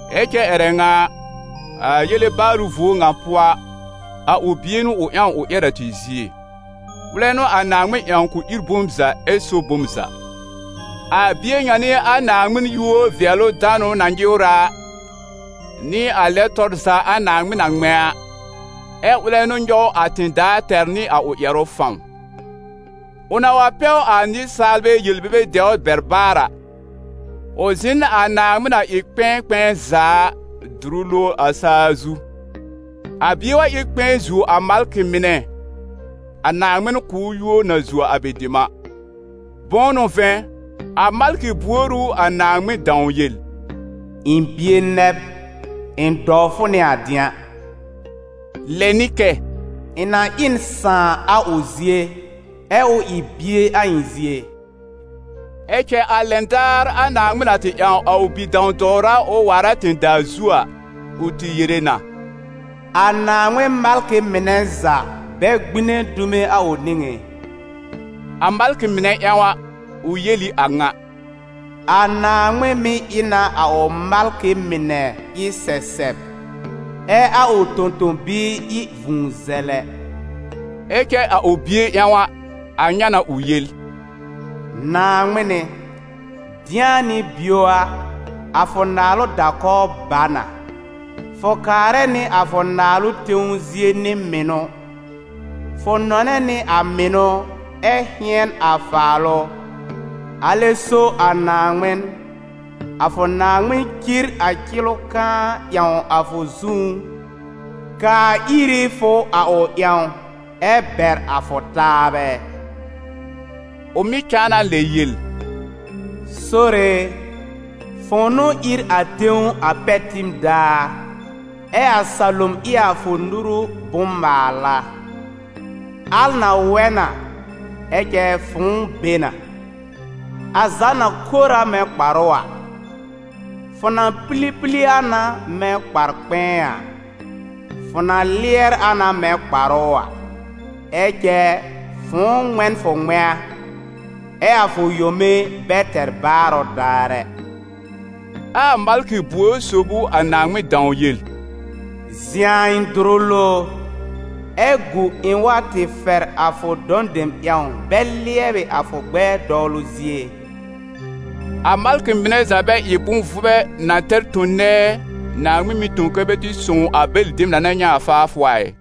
ɛ cɛ ƴɛrɛ ŋa a, a yele baarʋ vuo ŋa pʋɔ a, a ʋ Bie n'ʋ ʋ ƴãw ʋ ƴɛr a tɩ zie. Ʋlɛ n'ʋ a Naaŋmɩn ƴãw k'ʋ ír bom za ɛ so bom za. A Bie ŋa n'ɩ a Naaŋmɩn yúor-vɩɛlʋ-danʋ na nyɩwrɛ a, nɩ a lɛ tɔr za a Naaŋmɩn na ŋmɛ̃ a, ɛ ʋlɛ n'ʋ nyɔw a tẽ-daa tɛr nɩ a ʋ ƴɛrʋ fãw. Ʋ na wa pɛw a nɩsaalbɛ yel-bebe dɛwr bɛr baar a, ʋ zɩ̃ n a Naaŋmɩn na ɩ kpɛ̃ɛ kpɛ̃ɛ za a, dʋrʋ lowr a saa zu. A Bie wa ɩ n kpɛ̃ɛ zuo a malkɩ mɩnɛ, a Naaŋmɩn kʋ̀ ʋ yúor na zuo a bɛ dem a. Bʋ̃ʋ n'ʋ vɛ̃, a malkɩ buor ʋ a Naaŋmɩn dãw yel: «Ɩ̃ bie nɛ b, ɩ̃ dɔw fʋ nɩ a dɩ̃a?» Lɛ nɩ kɛ: «Ɩ̃ na ɩ n sãà a ʋ zie, ɛ ʋ ɩ bie a ɩ̃ zie?» Ɛ cɛ a lɛn daar a Naaŋmɩn na tɩ ƴãw a ʋ Bi-dãw-dɔwra ʋ waar a tẽ-daa zu a, ʋ tɩ yere na: «A Naaŋmɩn malkɩ mɩnɛ za, bɛ gbine dume a ʋ nĩŋé.» A malkɩ mɩnɛ ƴãw a, ʋ yel ɩ a ŋa: «A Naaŋmɩn mɩ́ ɩ na a ʋ malkɩ mɩnɛ ɩ sɛsɛb, ɛ a ʋ tõ-tõ-biir ɩ vũu-zɛlɛ.» Ɛ cɛ a ʋ Bie ƴãw a, a ŋa n'a ʋ yel: «Naaŋmɩn ɩ, dɩ̃a nɩ bio a, a fʋ naalʋ da-kɔw ba na, fʋ kaarɛ nɩ a fʋ naalʋ tẽw zie nɩ mɩnʋ. Fʋ nɔnɛ nɩ a mɩnʋ ɛ hɩ̃ɛn a faalʋ, alɛ so a Naaŋmɩn, a fʋ Naaŋmɩn, cir a cɩlʋ kãá ƴãw a fʋ zũú, kaa ir ɩ fʋ a ʋ ƴãw, ɛ bɛr a fʋ taabɛ.» Ʋ mɩ̀ cãa na lɛ yel: «Sore e, fʋ̃ʋ n'ʋ ír a tẽw a pɛr tib daar, ɛ a salom ɩ a fʋ nuru bʋ̃-maala. Al na wɛ na, ɛ cɛ fʋ̃ʋ be na. A za na kor a mɛ̃ kparʋ a, fʋ na pili pili a na mɛ̃ kpar-kpɛ̃ɛ a, fʋ na lɩɛr a na mɛ̃ kparʋ a, ɛ cɛ fʋ̃ʋ ŋmɛ̃ n fʋ ŋmɛ̃a, ɛ a fʋ yome bɛ tɛr baarʋ daar ɛ.» Ɛ a malkɩ buor sob ʋ a Naaŋmɩn dãw yel: «Zɩ̃ a ɩ̃ dʋrʋ lowr, ɛ gu ɩ̃ wa tɩ fɛr a fʋ dɔ̃ dem ƴãw bɛ lɩɛbɩ a fʋ gbɛɛ dɔwlʋ zie?» A malkɩ mɩnɛ za bɛ ɩ bʋ̃-vʋbɛ na tɛr tõ-nɛɛ, Naaŋmɩn mɩ́ tõ kɛ́ bɛ tɩ sõw a bɛlɩ dem na na nyɛ̃ a faafʋ a ɩ?